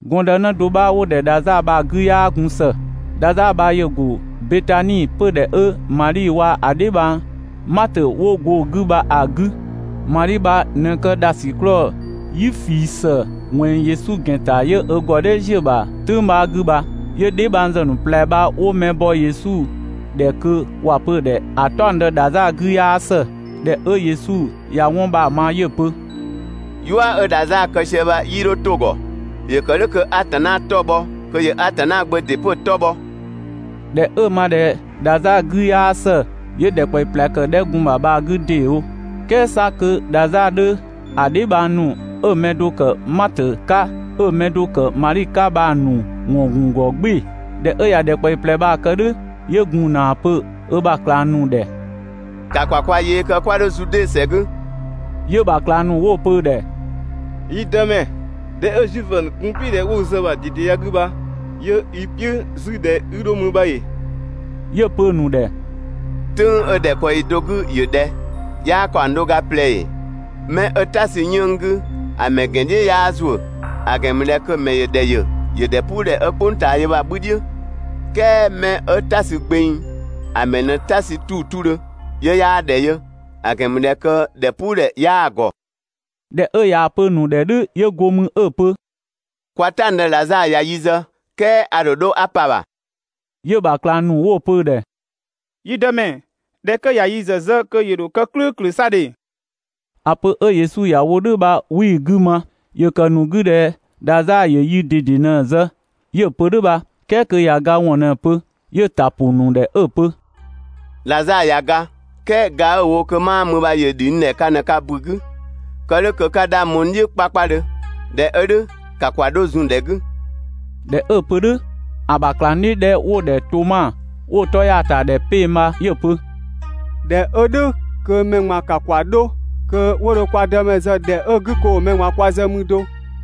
Gɔndënë do 'bha 'wo‑ ‑dhɛ Dhazaa bha‑ 'gü 'yaa gun ‑së. Dhazaa bha ‑yö ‑go Betani, 'pödhɛ 'ö Madhi waa‑ ö dheebhang Matö 'wo go‑ 'gü bha‑ 'gü. Madhi bha ꞊në kë ‑dhasiklɔɔ "yi ꞊fii ‑së ꞊wɛnng Yesu ‑gɛn ‑ta 'yö ö ‑gɔ "dhɛ ‑ziö ‑bha "tʋ̈ng 'bha 'gü bha. 'Yö dheebhang ‑zë ‑nu ꞊plɛ bha 'wo mɛ bɔ Yesu ‑dhɛ kö ‑wa pö‑ ‑dhɛ ‑a "taɔngdë Dhazaa 'gü 'yaa ‑së. ꞊Dhɛ 'ö Yesu ꞊ya 'wɔn bha‑ ma 'yö‑ pö: «"Yua 'ö Dhazaa kë sië bha 'yii 'dho 'to‑ ‑gɔ. ‑Yö ‑kë "dhʋ̈ kö Atanna 'tɔ‑ bhɔ, kö ‑yö Atanna Gbö ‑dɩ 'pö‑ 'tɔ bhɔ.» ꞊Dhɛ 'ö‑ ma ꞊dhɛ Dhazaa 'gü 'yaa ‑së, 'yö ‑dhɛkpaɔyi ꞊plɛ ‑kë ‑dhɛ 'ö gun‑ 'gü bha‑ 'gü ‑deewo. "Kɛɛ 'sa kö Dhazaa 'dhö, ‑a dheebhang ‑nu 'ö‑ mɛ do ‑kë Matö 'ka, 'ö‑ mɛ do ‑kë Madhi 'ka bha‑ ‑nu ‑wɔn ‑gun ‑gɔ "gbɩɩ‑. ꞊Dhɛ 'ö ꞊ya ‑dhɛkpaɔyi ꞊plɛ bha‑ kë "dhʋ̈, 'yö gun ‑na ‑a pö ö ‑bha ꞊klang ‑nu ‑dhɛ: «‑Ka ‑kwa kwa yee kë 'kwa 'dho Zude ‑sɛ 'gü!» 'Yö‑ ‑bha ꞊klang ‑nu 'wo‑ pö‑ ‑dhɛ: «Yi Dëmɛ, ‑dhɛ 'ö Zuifö ‑nu gun‑ "piʋ̈ ꞊dhɛ 'wo i zë‑ ‑bha ꞊dede ya‑ 'gü bha 'yö i "piʋ̈ 'zü ꞊dhɛ 'i 'dho mü bha ‑ee?» 'Yö‑ pö‑ ‑nu ‑dhɛ: «"Tʋ̈ng 'ö ‑dhɛkpaɔyi do 'gü ‑yö ꞊dhɛ? 'Yaa ‑kaɔng do ga ꞊plɛ ‑ee? 'Mɛ 'ö "ta sü 'yënng‑ 'gü ‑a ‑mɛ ‑gɛn "dhiʋ̈ 'yaa ‑zuö, ‑a ‑gɛn ‑mü ꞊dhɛ kö‑ ‑mɛ ‑yö ‑dhɛ ‑yö ‑dhɛpuudhɛ 'ö "kpʋng ꞊taa yö bha‑ 'bhü "dhiʋ̈. "Kɛɛ 'mɛ 'ö "ta sü gbeng, ‑a ‑mɛ ꞊në "ta sü 'tuu‑ 'tudhö, 'yö 'yaa ‑dhɛ yö, ‑a ‑gɛn ‑mü ꞊dhɛ kö ‑dhɛpuudhɛ 'yaa‑ ‑gɔ.» ꞊Dhɛ 'ö ꞊yaa‑ pö‑ ‑nu ‑dhɛ "dhʋ̈ 'yö go mü 'ö‑ pö: «Kwa "taɔngdë Dhazaa ꞊ya yi zë, "kɛɛ a ‑dho 'dho 'a pa‑ ‑bha.» 'Yö‑ ‑bha ꞊klang ‑nu 'wo‑ pö‑ ‑dhɛ: «Yi Dëmɛ, ꞊dhɛ 'kö ꞊ya yi ‑zë zë kö ‑yö ‑dho kë "klʋ̈ʋ̈klʋ̈ 'sa ‑dhe!» ‑A pö 'ö Yesu ‑ya wo "dhʋ̈ bha 'wii‑ 'gü ma. ‑Yö ‑kë ‑nu 'gü ꞊dhɛ Dhazaa ‑yö yi ꞊dede ꞊në zë 'yö‑ pö "dhʋ̈ bha, "kɛɛ kö ‑ya ga ‑wɔn ꞊në‑ pö. 'Yö‑ ‑ta ‑pʋ ‑nu ‑dhɛ 'ö‑ pö: «Dhazaa ꞊ya ga. "Kɛɛ ga 'ö‑ wo kö 'maa mü bha ‑yö ‑dhi n ‑dhɛ ka ꞊në ka ‑bu 'gü, kë "dhʋ̈ kö 'ka 'dhang bho n "dhiʋ̈ 'kpakpadhö. ꞊Dhɛ 'ö "dhʋ̈ ‑ka ‑kwa 'dho zun‑ ‑dhɛ 'gü!» ꞊Dhɛ 'ö‑ pö "dhʋ̈, ‑a ‑bha ꞊klangdhiʋ̈ 'dhɛ 'wo‑ ‑dhɛ Toma 'wo‑ 'tɔ ‑ya ‑ta ‑dhɛ 'peng‑ bha 'yö‑ pö: «꞊Dhɛ 'ö "dhʋ̈ kö mɛ ꞊gban ‑ka ‑kwa 'dho kö 'wo dho kwa Dëmɛ zë ‑dhɛ 'ö‑ 'gü kö ‑wo mɛ ꞊gban kwa zë mü do!»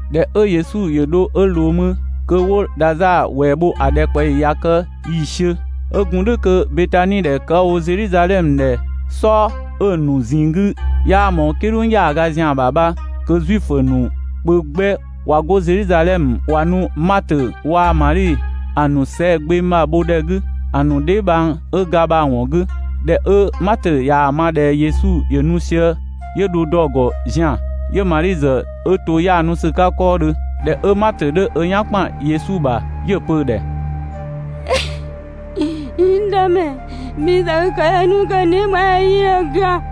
꞊Dhɛ 'ö Yesu ‑yö dho 'ö ꞊loo mü, kö 'wo Dhazaa ‑wɛɛ bho ‑a ‑dhɛkpaɔyi ꞊ya kë ‑yiisiö. 'Ö gun "dhʋ̈ kö Betani ‑dhɛ kë 'ö‑ wo Zedhizadhɛmö ‑dhɛ "sɔɔ, 'ö‑ ‑nu ꞊zinng 'gü ‑dhɛ 'yaa ꞊mɔɔ "kidhʋng ‑yaaga ‑zian ‑bha bha, 'kö Zuifö ‑nu kpö 'gbɛ ꞊wa 'go Zedhizadhɛmö ꞊wa nu Matö waa‑ Madhi ‑a ‑nu sɛɛgbengbha bho ‑dhɛ 'gü ‑a ‑nu dheebhang 'ö ga bha‑ ‑wɔn 'gü. ꞊Dhɛ 'ö Matö ꞊yaa‑ ma ꞊dhɛ Yesu ‑yö nu sië, 'yö dho dɔ‑ ‑gɔ zian‑, 'yö Madhi ‑zë 'ö to 'yaanu ‑sü 'ka 'kɔɔdhö. ꞊Dhɛ 'ö Matö 'dhö 'ö "yan ‑kpan Yesu ‑bha 'yö‑ pö‑ ‑dhɛ: «N Dëmɛ, bhi ‑zë i ‑kë yö 'nu kö n dheebhang ya 'yii 'dho ga,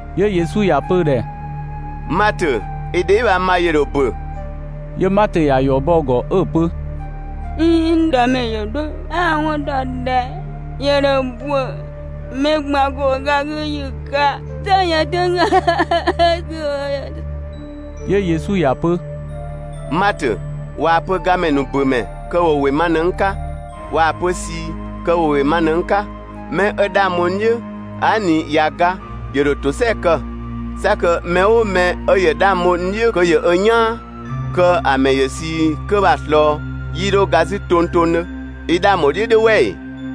'Yö Yesu ‑ya pö‑ ‑dhɛ: «Matö, i dheebhang bha ‑yö ‑dho ‑bö!» 'Yö Matö ‑ya ‑yɔ bɔ‑ ‑gɔ 'ö‑ pö: «꞊Iin, n Dëmɛ, ‑yö "dhʋ̈, a‑ 'wɔn ‑dɔ ꞊dhɛ ‑yö ‑dho ‑bö mɛ ꞊gban ‑go ga 'gü ‑yi 'ka "sɛ yën "tʋ̈ng 'gü.» 'Yö Yesu ‑ya pö: «Matö, ꞊waa‑ pö gamɛ ‑nu ‑bö ‑mɛ, kö ‑wo ‑wɩ ma ꞊në n 'ka, ꞊waa‑ pö ꞊sii, kö ‑wo ‑wɩ ma ꞊në‑ 'ka. 'Mɛ 'ö 'dhang bho n "dhiʋ̈, aa" ꞊ni ꞊ya ga, ‑yö ‑dho ‑tosɛa kë. 'Sa kö mɛ "ʋʋ mɛ 'ö ‑yö 'dhang bho n "dhiʋ̈ kö ‑yö ö "yaan, kö‑ ‑mɛ ‑yö ꞊sii 'kö bha‑ ꞊slɔɔ, 'yii 'dho ga 'zü tongtongdhö. I 'dhang ‑bho "dhiʋ̈ "dhʋ̈ "wɛ ‑ee?»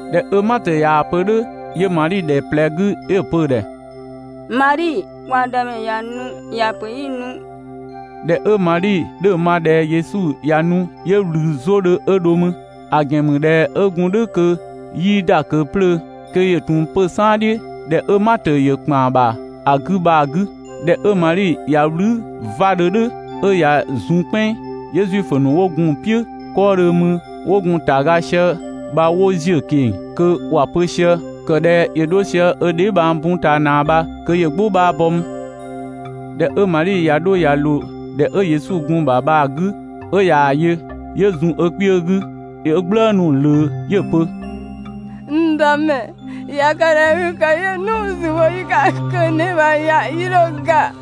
꞊Dhɛ 'ö Matö ꞊yaa‑ pö "dhʋ̈, 'yö Madhi ‑dhɛ ꞊plɛ 'gü 'yö‑ pö‑ ‑dhɛ: «Madhi, kwa Dëmɛ ꞊ya nu, ‑ya ‑pö 'i nu.» ꞊Dhɛ 'ö Madhi 'dhö‑ ma ꞊dhɛ Yesu ꞊ya nu, 'yö ꞊wlü 'zodhö 'yö dho mü. ‑A ‑gɛn ‑mü ꞊dhɛ 'ö gun "dhʋ̈ kö 'yii ‑da ꞊kö 'plöö, kö ‑yö ‑tun 'pö‑ "saan "dhiʋ̈, ‑dhɛ 'ö Matö 'dhö ‑kpan ‑bha ‑a 'gü bha‑ 'gü. ꞊Dhɛ 'ö Madhi ꞊ya "wlü 'vadhö "dhʋ̈ 'ö ꞊ya zun "kpɛnng, 'yö Zuifö ‑nu 'wo gun‑ "piʋ̈ 'kɔɔdhö 'mü 'wo gun‑ ‑taga sië bha 'wo ‑ziö ꞊keng‑ kö ‑wa pö sië: «‑Kë ꞊dhɛ ‑yö 'dho sië ö dheebhang bun ꞊taa ꞊naa bha kö yö "gbʋ 'bha bɔ 'mü.» ꞊Dhɛ 'ö Madhi ꞊ya 'dho ꞊ya ꞊loo ‑dhɛ 'ö Yesu‑ gun‑ ‑bha bha‑ 'gü 'ö ꞊yaa‑ yö, 'yö zun ö kpiö 'gü 'yö "gblëënu‑ ꞊wlöö 'yö‑ pö: «N Dëmɛ, ꞊ya kë ꞊dhɛ i kë yö 'nu‑ zü bho ‑yi 'ka kö n dheebhang ya 'yii 'dho ga!»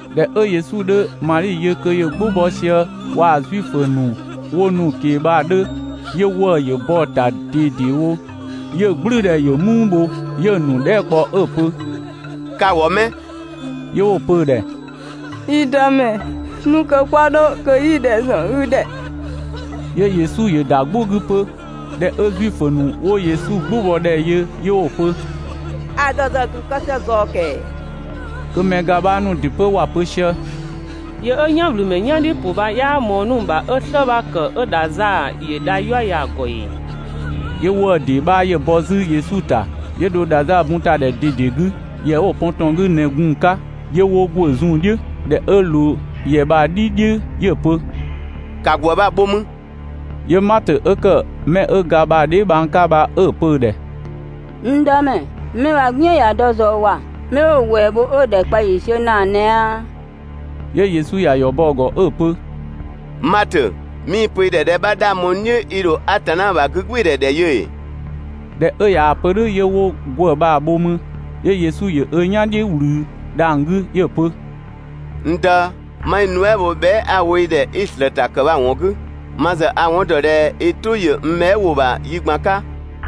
꞊Dhɛ 'ö Yesu 'dhö Madhi yö kö ‑yö "gbʋ bɔ sië waa‑ Zuifö ‑nu 'wo nu‑ ꞊keng‑ bha‑ 'dhö, 'yö ‑wëë ‑yö bɔ‑ ‑ta ꞊dedewo, 'yö‑ "gblʋ̈ʋ̈dhɛ ‑yö "muu bho, 'yö‑ ‑nu dhɛɛ" kpɔ 'ö‑ pö: «Ka‑ ‑wɔ 'mɛ?» 'Yö 'wo‑ pö‑ ‑dhɛ: «Yi Dëmɛ, nu kö 'kwa 'dho kö 'yi‑ ‑dhɛ ‑zɔn i ‑dhɛ!» 'Yö Yesu ‑yö ‑da "gbʋ 'gü 'pö. ꞊Dhɛ 'ö Zuifö ‑nu 'wo Yesu "gbʋbɔdhɛ yö 'yö 'wo‑ pö: «‑A ‑dhɔ ‑zë ‑gun kë sië ꞊zɔɔ ‑kɛɛ!» Kö mɛ ga 'bha ‑nu ‑dɩ 'pö ‑wa pö sië: «Yö 'ö "yanwlümɛ "yan "dhiʋ̈ ‑pʋ bha 'yaa ꞊mɔɔ 'nu‑ ‑bha 'ö "slë 'bha ‑kë 'ö Dhazaa ‑yö dha "yua ya‑ ‑gɔ ‑ee?» 'Yö ‑wëë ‑dee 'bha ‑yö bɔ 'zü Yesu ‑ta, 'yö dho Dhazaa bun ‑ta ‑dhɛ ꞊dede 'gü. ‑Yɛ 'wo‑ pɔn ‑tɔn 'gü ꞊në gun‑ 'ka, 'yö 'wo ‑gwë zun‑ "dhiʋ̈. ꞊Dhɛ 'ö ꞊loo ‑yɛ bha‑ "dhi "dhiʋ̈ 'yö‑ pö: «‑Ka ‑gwë bha‑ bho mü!» 'Yö Matö 'ö ‑kë mɛ 'ö ga bha‑ dheebhang 'ka bha 'ö‑ pö‑ ‑dhɛ: «N Dëmɛ, 'mɛ bha‑ "gbiën ꞊ya dɔ ꞊zɔɔ ‑wa!» 'Mɛ 'wo‑ ‑wɛɛ bho 'ö‑ ‑dhɛkpaɔyi ‑yiisiö ‑naa ꞊nɛ aa!» 'Yö Yesu ‑ya ‑yɔ bɔ‑ ‑gɔ 'ö‑ pö: «Matö, 'mii‑ pö i ‑dhɛ ꞊dhɛ 'bha 'dhang bho n "dhiʋ̈, i ‑dho Atanna ‑bha 'gügbɩɩdhɛ ‑dhɛ yö ‑ee?» ꞊Dhɛ 'ö ꞊yaa‑ pö "dhʋ̈ 'yö 'wo ‑gwë bha‑ bho 'mü, 'yö Yesu ‑yö ö "yan "dhiʋ̈ ꞊wlü dhang‑ 'gü 'yö‑ pö: «N Dë, 'ma i nuɛ" bho bhɛa" 'a‑ wo i ‑dhɛ 'i‑ ‑slëëta ‑kë bha‑ ‑wɔn 'gü. Ma ‑zë a‑ 'wɔn ‑dɔ ꞊dhɛ i "tʋ ‑yö n bhɛa" ‑wʋ ‑bha yi ꞊gban 'ka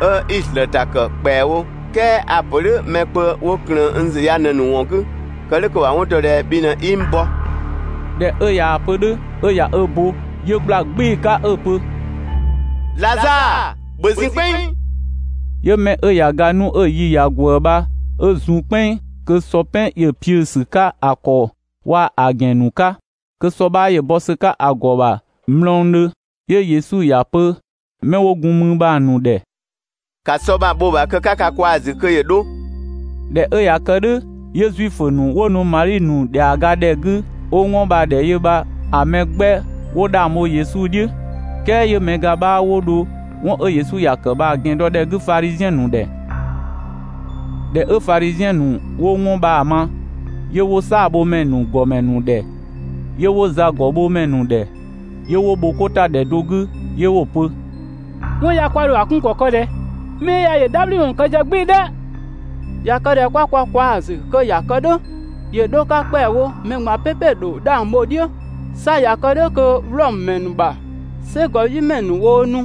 'ö 'i‑ ‑slëëta ‑kë ‑kpɛawo, "kɛɛ a‑ ‑pö "dhʋ̈ mɛ kpö 'wo ‑klëën n ‑zü ya ꞊në‑ ‑nu ‑wɔn 'gü, kë "dhʋ̈ kö ‑wa 'wɔn dɔ ꞊dhɛ bhi ꞊në 'i n bɔ.» ꞊Dhɛ 'ö ꞊yaa‑ pö "dhʋ̈ 'ö ꞊ya ö bo, 'yö ꞊gbla "gbɩɩ‑ 'ka 'ö‑ pö: «Dhazaa, ‑bhö zun "kpɛnng!» 'Yö 'mɛ 'ö ꞊ya ga 'nu 'ö‑ yi ꞊ya ꞊gwëë bha 'ö zun "kpɛnng kö sɔ "pɛn ‑yö piʋ̈‑ ‑sü 'ka‑ ‑kɔ waa‑ ‑gɛn ‑nu 'ka, kö sɔ 'bha ‑yö bɔ ‑sü 'ka‑ ‑gɔ ‑bha mlɔngdhö. 'Yö Yesu ‑ya pö 'mɛ 'wo gun mü bha‑ ‑nu ‑dhɛ: «‑Ka sɔ bha‑ bho‑ ‑bha kö 'ka ka kwaa‑ ‑zü kö ‑yö 'dho!» ꞊Dhɛ 'ö ꞊ya kë "dhʋ̈, 'yö Zuifö ‑nu 'wo nu Madhi ‑nu ‑dhɛaga ‑dhɛ 'gü 'wo 'wɔn bha‑ ‑dhɛ yö bha‑ mɛ 'gbɛ 'wo 'dhang bho Yesu "dhiʋ̈. "Kɛɛ 'yö‑ mɛ ga 'bha 'wo dho 'wɔn 'ö Yesu ‑ya ‑kë bha‑ ‑gɛn dɔ ‑dhɛ 'gü Fadhiziɛn ‑nu ‑dhɛ. ꞊Dhɛ 'ö Fadhiziɛn ‑nu 'wo 'wɔn bha‑ ma, 'yö 'wo "saabhomɛ ‑nu ‑gɔmɛ ‑nu ‑dhɛ, 'yö 'wo zagɔbhomɛ ‑nu ‑dhɛ 'yö 'wo bhokota ‑dhɛ do 'gü 'yö 'wo‑ pö: «'Wɔn ya kwa ‑dho ‑a 'kun ‑kɔ kë ꞊dhɛ? Mɛ 'ö ya ‑yö "dhabhliwɔn ‑nu kë sië "gbɩɩ‑ "dhɛ! ꞊Ya kë ꞊dhɛ 'kwa kwa kwaa‑ ‑zü kö ‑ya kë "dhʋ̈ ‑yö 'dho‑ 'ka ‑kpɛawo mɛ ꞊gban "pɛpɛ ‑dho 'dhang bho‑ "dhiʋ̈. 'Sa ꞊ya kë "dhʋ̈ kö Wlɔmö mɛ ‑nu ‑bha "sɛgɔdhiʋ̈mɛ ‑nu woo nu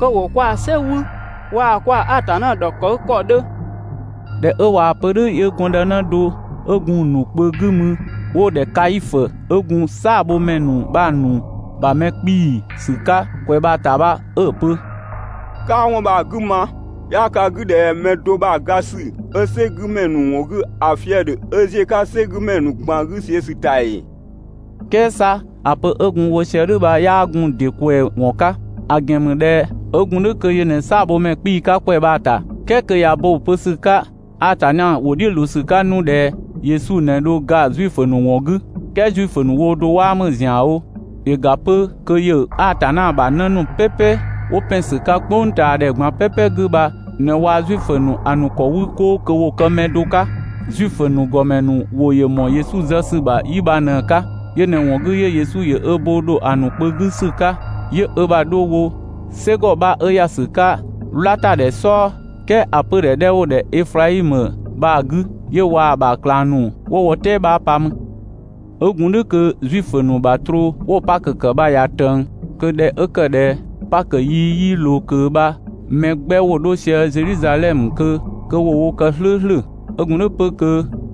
kö ‑wo kwaa‑ "sɛ wü waa‑ kwaa‑ Atanna ‑dhɔkëgükɔ 'dhö!» ꞊Dhɛ 'ö ꞊waa‑ pö "dhʋ̈ 'yö gɔndënë do 'ö gun‑ ‑nu kpö 'gü mü 'wo‑ ‑dhɛ Kaifö, 'ö gun "saabhomɛ ‑nu bha‑ ‑nu bha mɛ 'kpii‑ ‑sü 'ka ‑kwɛ bha‑ ‑ta bha 'ö‑ pö: «'Kaa 'wɔn bha‑ 'gü ma!» 'Yaa ka 'gü ꞊dhɛ mɛ do ‑bha ga ‑sü 'ö "sɛ 'gü ‑mɛ ‑nu ‑wɔn 'gü ‑a fië‑ ‑dhö 'ö ‑ziö "sɛgümɛ ‑nu ꞊gban 'gü see‑ ‑sü ‑ta ‑ee?» "Kɛɛ 'sa ‑a pö 'ö gun‑ wo sië "dhʋ̈ bha 'yaa gun‑ ‑dɩ ꞊kwɛɛ‑ ‑wɔn 'ka, ‑a ‑gɛn ‑mü ꞊dhɛ 'ö ‑gun "dhʋ̈ kö yö ꞊në "saabhomɛ ‑nu ‑gɔmɛ 'ka ‑kwɛ bha‑ ‑ta, "kɛɛ kö ꞊ya bo‑ pö ‑sü 'ka Atanna ‑wʋ "dhiʋ̈ ꞊loo ‑sü 'ka 'nu ꞊dhɛ Yesu ꞊në dho ga Zuifö ‑nu ‑wɔn 'gü, "kɛɛ Zuifö ‑nu woo do 'waa ‑mü ‑zianwo, ‑yö ‑ga 'pö kö ‑yö Atanna ‑bha 'në ‑nu "pɛpɛ 'wo ‑pɛn ‑sü 'ka "kpʋngtaadhɛ ꞊gban "pɛpɛ 'gü bha ꞊në waa‑ Zuifö ‑nu ‑a ‑nu ‑kɔ 'wü 'koo kö ‑wo kë mɛ do 'ka. Zuifö ‑nu ‑gɔmɛ ‑nu ‑wʋ ‑yö ‑mɔɔ Yesu ‑zë ‑sü ‑bha 'yi bha ꞊në‑ 'ka. Yö ꞊në‑ ‑wɔn 'gü 'yö Yesu ‑yö ö bo ‑dho ‑a ‑nu kpö 'gü ‑sü 'ka, 'yö ö ‑bha 'dho wo "sɛgɔ 'bha 'ö ‑ya ‑sü 'ka "wlatadhɛ "sɔɔ, "kɛɛ ‑a 'pödhɛ 'dhɛ 'wo‑ ‑dhɛ Eflaimö bha‑ 'gü 'yö waa‑ ‑bha ꞊klang ‑nu 'wo wo "tɛɛ 'bha pa mü. 'Ö gun "dhʋ̈ kö Zuifö ‑nu ‑bha troo 'wo‑ Pakö ‑kë bha ꞊ya ꞊tëng. Kö ꞊dhɛ 'ö ‑kë ꞊dhɛ Pakö yi 'yii ꞊loo ꞊kö bha mɛ 'gbɛ ‑wo 'dho sië Zedhizadhɛmö kö ‑wo wo kë "slʋ̈ʋ̈slʋ̈. 'Ö gun "dhʋ̈ 'pö kö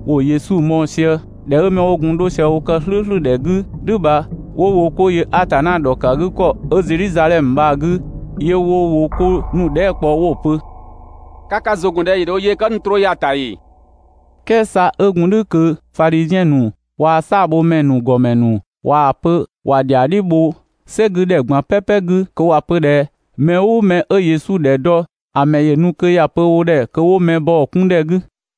‑wo Yesu mɔɔ‑ sië. ꞊Dhɛ ('ö 'mɛ 'wo gun 'dho sië wo ‑kë "slʋ̈ʋ̈slʋ̈ ‑dhɛ 'gü "dhʋ̈ bha) 'wo wo 'ko yö Atanna ‑dhɔkëgükɔ 'ö Zedhizadhɛmö bha‑ 'gü, 'yö 'wo wo 'ko ‑nu dhɛɛ" kpɔ 'wo‑ pö: «Ka ka ‑zʋ ‑gɔn ꞊dhɛ ‑yö ‑dho ö yee kë 'ö nu troo ya‑ ‑ta ‑ee?» "Kɛɛ 'sa 'ö gun "dhʋ̈ kö Fadhiziɛn ‑nu waa‑ "saabhomɛ ‑nu ‑gɔmɛ ‑nu ꞊waa‑ pö ‑wa ‑dhɛa "dhiʋ̈ bho "sɛ 'gü ‑dhɛ ꞊gban "pɛpɛ 'gü kö ‑wa pö ꞊dhɛ mɛ "ʋʋ mɛ 'ö Yesu ‑dhɛ dɔ, ‑a mɛ ‑yö nu kö ‑ya pö wo ‑dhɛ kö 'wo mɛ bɔ‑ 'kun ‑dhɛ 'gü.